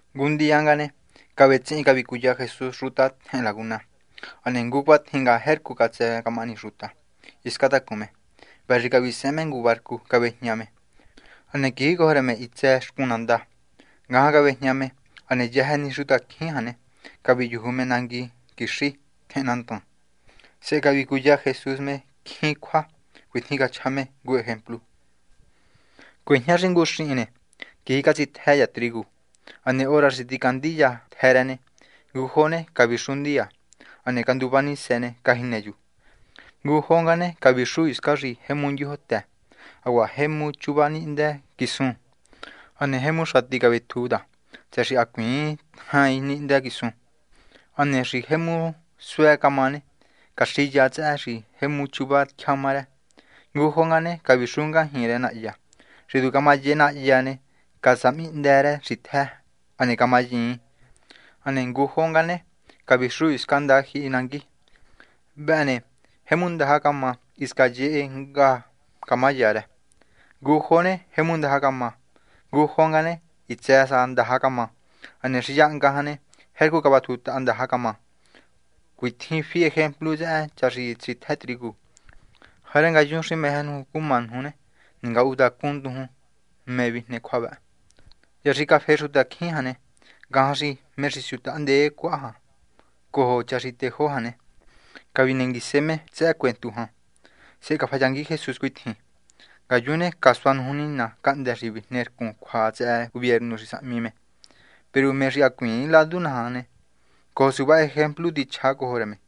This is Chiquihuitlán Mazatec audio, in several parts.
Ngu ndiya nga ne, cavetsihin cavicuya Jesús xuta tjehen laguna. Hane ngu cuatjin nga jercu tu catsë camahani xuta hiscan tacun me. Vëhë xi cavisehen me ngu barcu cavéjña me. Hane quijicojo rë me hitsë xcun nandá, ngajan cavéjña. Hane yëjë ni xutacjín jan ne, caviyuju me nangui quixí tjehen nandan. Sehe cavicuya Jesús me jemu cjín cjua. Cuitjin cachja me ngu ejemplu: ―Cuejña ni xi ngu xihin ne, quiji catsitjë cha trigu. Hane hora xi ticandi cha tjë rë ne, ngujo ne, cavixu ndiya. Hane canduva nisë ne, cajinë chu. Ngujo nga ne, cavixu hiscan xi jemu ndyojotë, hacuaha jemu chuva nihndë quisun. Hane jemu xati cavetju ta tsëhë xi hacuiin tjain nihndë quisun. Hane xi jemu suë camá ne, caxiya tsëhë xi jemu chuva tyjama rë. Ngujo nga ne, cavixu ngajñi rë nahyá. Xi tu camayehe nahyá ne, casahmihndë rë xitjë, hane camayiin. Hane ngujo nga ne, cavixu hiscan ndajyihi nangui. Vëhë ne, jemu ndaja camá, hisca yehe hnga camá ya rë. Ngujo ne jemu ndaja camá. Ngujo nga jan ne, hitsë sa ndaja camá. Hane xi yahnga jan ne, jercu vatjutaha ndaja camá. Cuatjin fi ejemplu tsëhë cha xi tsitjë trigu. ’Jarë ngayun xi meje nuju cuma nuju ne, ningatuhuntacun nduju mé vijne cjua vë. Hya xi cafe xutacjín jan ne, ngajan xi me xi siundee cuaha jan cojo cha xi tejó jan ne, cavinenguise me tsëhë cuentu jan. Sehe cafayangui Jesús cuitjin: ―Ngayun ne casua nuju Nina cahndë́ xi vijne rcun cjuatahahma tsëhë gubiernu xi sahmi me. Peru me xi hacuiin ladu naja ne, cojo suva ejemplu tichjá cojo rë me,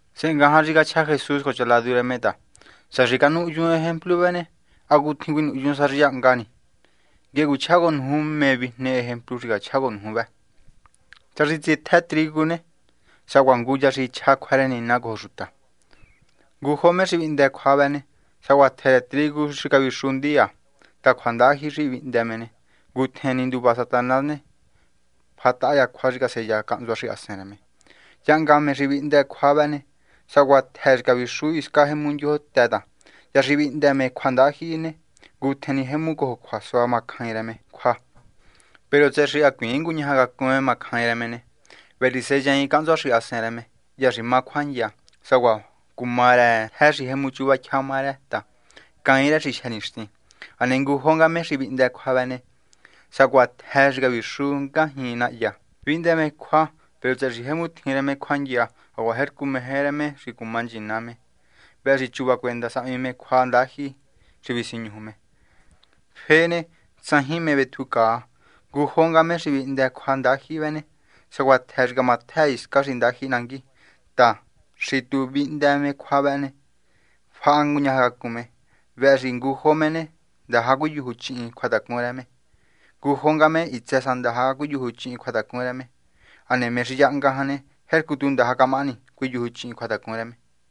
Sehe ngajan xi cachja Jesús cojo cha ladu rë me ta: ―Sá xi ha canuhyuun ejemplu vëhë ne, hacutjin cuinuhyun sa xi yahnga ni. Nguehe cuichjá cojo nuju mé vijne ejemplu xi cachjá cojo nuju vë. Cha xi tsitjë trigu ne, sacuaha ngu cha xi chja cjua rë Nina cojo xuta. Ngujo me xi vihndë cjua vëhë ne, sacuaha tjë rë trigu xi cavixu ndiya ta cjua ndajyihi xi vihndë me ne, ngutjen ni nduva Satanás ne, fahataha cjua xi caseya cahntsua xahasen rë me. Yahnga nga me xi vihndë cjua vëhë ne, sacuaha tjë xi cavixu hiscan jemu ndyojotë ta hya xi vihndë me cjua ndajyihi ne, ngutjen ni jemu cojo cjuasua macjain rë me cjua. Peru tsëhë xi hacuiin nguñaja cacun me macjain rë me ne, vëhë xi seyaain cahntsua xahasen rë me hya xi má cjuandya, sacuaha cumá rë tjë xi jemu chuva tyjama rë ne ta, cain rë xi jyë nixtin. Hane ngujo nga me xi vihndë cjua vëhë ne, sacuaha tjë xi cavixu ngajñi nahyá. Vihndë me cjua. Peru tsëhë xi jemu tjin rë me cjuandya hacuaha jercu meje rë me xi cuma nchina me, vëhë xi chuva cuenda sahmi me cjua ndajyihi xi cavisiñuju me. Fë ne, tsajin mé vetjucaa. Ngujo nga me xi vihndë cjua ndajyihi vëhë ne sacuaha tjë xi camatjë hiscan ndajyihi nangui ta xi tu vihndë me cjua vëhë ne, faha nguñajacacun me. Vëhë xi ngujo me ne, ndaja cuiyujuchihin cjuatacun rë me. Ngujo nga me ne, hitsë sa ndaja cuiyujuchihin cjuatacun rë me. Hane me xi yahnga jan ne, jercu tu ndaja camahani cuiyujuchihin cjuatacun rë.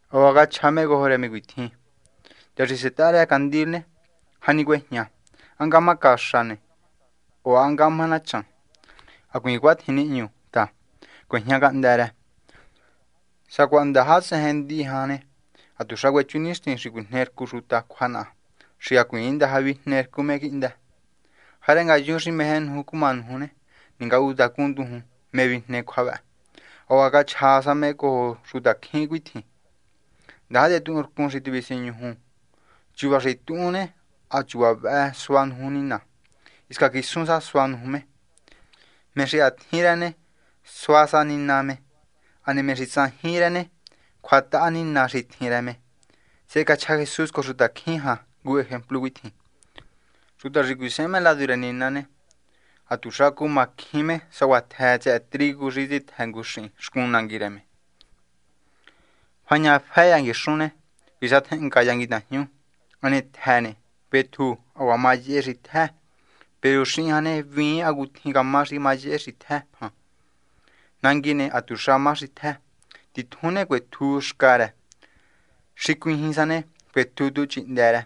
Hacuaha cachja me cojo rë me cuitjin: ―Hya xi setaha rë candil ne, ¿jani cuejña? ¿Há ngahma caxa ne? o ¿há ngahma nachan? Hacuiin cuatjin nihñu ta, cuejña cahndë́ rë. Sacuaha ndaja tsejen ndihi jan ne, hatuxa cuechu nixtin xi cuijne rcu xuta cjua naha xi hacuiin ndaja vijne rcun me quihndë. Jarë ngayun xi meje nuju cumá nuju ne, ningatuhuntacunndujun mé vijne cjua vë. Hacuaha cachja sa me cojo xutacjín cuitjin: ―Ndaja tetuhunrcun xi tivisiñuju. Chuva xi tuhun ne, ha chuva vëhë sua nuju Nina. Hisca quisun sa sua nuju me. Me xi ha tjin rë ne, sua sa Nina me, hane me xi tsajin cjín rë ne, cjuahataha Nina xi tjin rë me. Sehe cachja Jesús cojo xutacjín jan ngu ejemplu cuitjin: ―Xuta xi cuisehen me ladu rë Nina ne, ha tuxa cumá cjín me sacuaha tjë tsëhë trigu xi tsitjë ngu xihin xcun nangui rë me. Fañafë cha nguixun ne, visatjenhnga cha nguitajñu. Hane tjë ne, vetju, hacuaha mayehe xitjë. Peru xihin jan ne, hvíin hacutjin camá xi camayehe xitjë jan. Nangui ne, ha tuxa má xitjë. Titjun ne, cuetju xca rë. Xi cuijin sa ne, cuetju tú chihndë rë.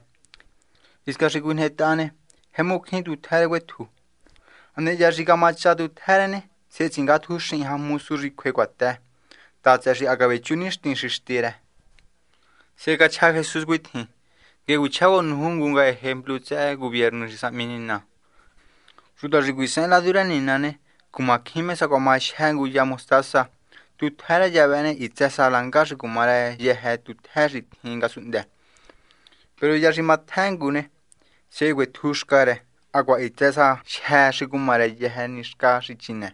Hiscan xi cuijnetaha ne, jemu cjín tutjë rë cuetju. Hane hya xi camacha tutjë rë ne, sehe tsingatju xihin jan mosu xi cjue cuatë ta tsëhë xi ha cavechu nixtin xi xtí rë. Sehe cachja Jesús cuitjin: ―Nguehe cuichjá cojo nuju ngu nga ejemplu tsëhë gubiernu xi sahmi Nina. Xuta xi cuisehen ladu rë Nina ne, cumacjín me sacuaha majyë ngu ya mostasa. Tutjë rë ya vëhë ne, hitsë sa langa xi cumá rë yëjë ni tutjë xi tjin ngasunhndë. Peru hya xi matjë ngu ne, sehe cuetju xca rë hacuaha hitsë sa jyë má xi cuma rë yëjë ni xca xi chine.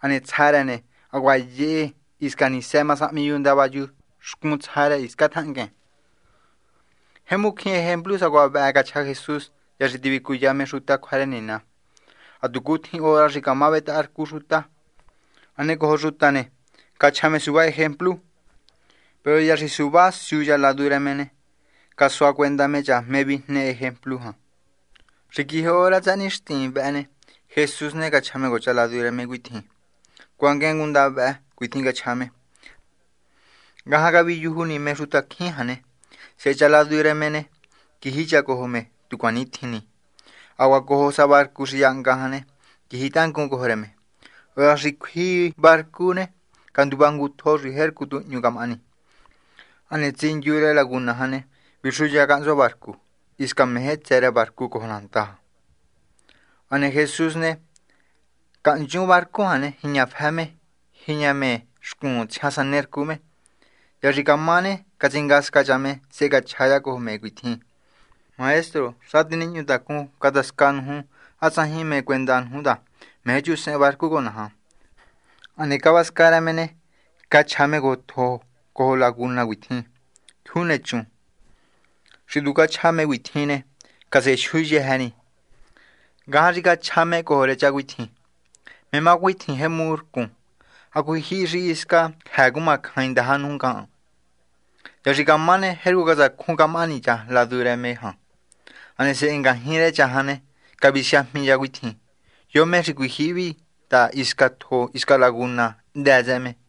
Hane tsja rë ne, hacuaha yehe, hisca nisë ma sahmi chu ndava chu xcun tsja rë hiscan tjahnguen. Jemu cjín ejemplu sacuaha vëhë cachja Jesús hya xi tivicuya me xuta cjua rë Nina, hatucutjin hora xi cama cavetaharcu xuta. Hane cojo xuta ne, cachja me suva ejemplu. Peru hya xi suva siu cha ladu rë me ne, casua cuenda me cha mé vijne yëjë ejemplu jan. Xi quiji hora tsëhë nixtin vëhë ne, Jesús ne, cachja me cojo cha ladu rë me cuitjin: ―Cuanguen ngunda vëhë. ―Cuitjin cachja me. Ngajan xi caviyuju ni me xutacjín jan ne, sehe cha ladu rë me ne, quiji cha cojo me tu cuanitjin ni. Hacuaha cojo sa barcu xi yahnga jan ne, quiji tangun cojo rë me. Hora xi cjui barcu ne, canduva ngu tjo xi jercu tu hñu camahani. Hane tsindyu rë laguna jan ne, vixuya cahntsua barcu, hisca meje tsë rë barcu cojo nandá. Hane Jesús ne, hisca cahnchun barcu jan jiñafë me, tijiña me xcun tsjian sanercu me. Hya xi camá ne, catsingasca cha me, sehe cachja cha cojo me cuitjin: ―Maestro. Xati nihñutacun catasca nuju. ¿Há tsajin mé cuenda nuju ta, meje xtyusehen barcu cojo naja? Hane cavasca rë me ne, cachja me cojo tjo cojo laguna cuitjin: ―Jyuu nechun. Xi tu cachja me cuatjin ne, casejyu yëjë ni. Ngajan xi cachja me cojo rë cha cuitjin: ―¿Mé má cuatjin jemu rcun? ¿Hacujyihi ni xi hisca cjëë cumacjain ndaja nuju ngahan? Hya xi camá ne, jercu catsacjun camahani cha ladu rë me jan. Hane sehe ngajñi rë cha jan ne, cavisiajmi cha cuitjin: ―¿Yo me xi cuijyihi vi? ta, hisca tjo hisca laguna hndë tsëhë me.